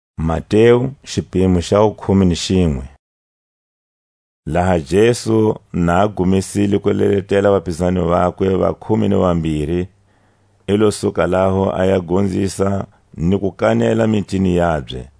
Johani a rumela mitsumi ka Jesu. Laha Jesu na gumesile ku leletela vapizani vakwe va khume ni vambiri, i lo suka laho a ya gonzisa ni ku kanela mitini yabye.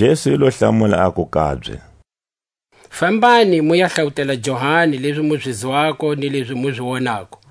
Jesu i lo hlamula, aku kabye: Fambani mu ya hlawutela Johani lezi mu zi zwako ni lezi mu zi wonako: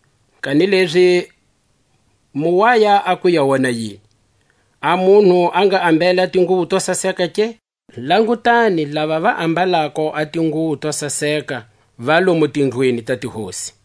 Kanilezi mu waya a ku ya wona yini? A munhu a nga ambele a tinguwo to saseka ke? Langutani, lava ve ambalako a tinguwo to saseka va lomu tindlwini ta tihosi.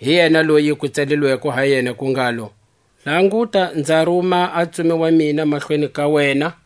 Hi yena loyi ku tsalilweko ha yena ku ngalo: Languta nza ruma a ntsumi wa mina mahlweni ka wena,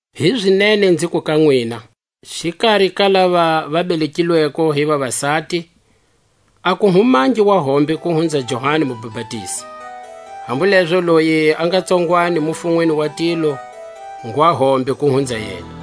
Hizinene nziku ka nwina: Xikari ka lava va belekilweko hi vavasati, a ku humangi wa hombe ku hunza Johani Mubapatizi; hambu lezo loyi a nga tsongwanyani mufunweni wa tilo ngwa hombe ku hunza yena.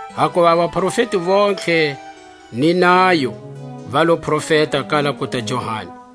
Hakuva a vaprofeti vontlhe ni nayo va lo profeta kala kuta Johani.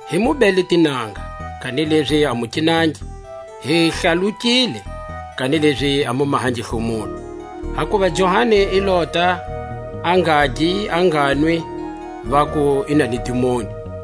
Hi mu bele tinanga, kanilezi a mu kinangi; hi hlalukile, kanilezi a mu mahangi hlomulo. Hakuva Johani i lota a ngagi a nganwi, vaku: I na ni dimoni.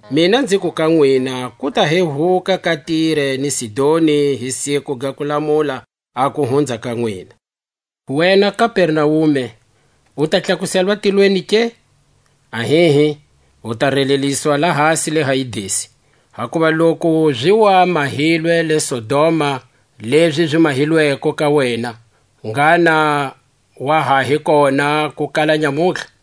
Mina nziku ka nwina ku ta hehuka ka Tire ni Sidoni hi siku ga kulamula, a ku hunza ka nwina. Wena Kapernaume, u ta tlakuselwa tilweni ke? Ahihi, u ta releliswa lahasi le Hayidesi; hakuva loku zi wa mahilwe le Sodoma lezi zi mahilweko ka wena, ngha na wa ha hi kona ku kala nyamutlha.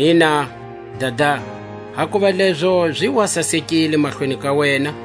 Ina, Dada, hakuva lezo zi wa sasekile mahlweni ka wena.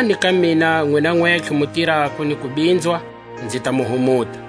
Tanani ka mina, nwina nwentlhe mu tirako ni ku binzwa, nzi ta mu humuta.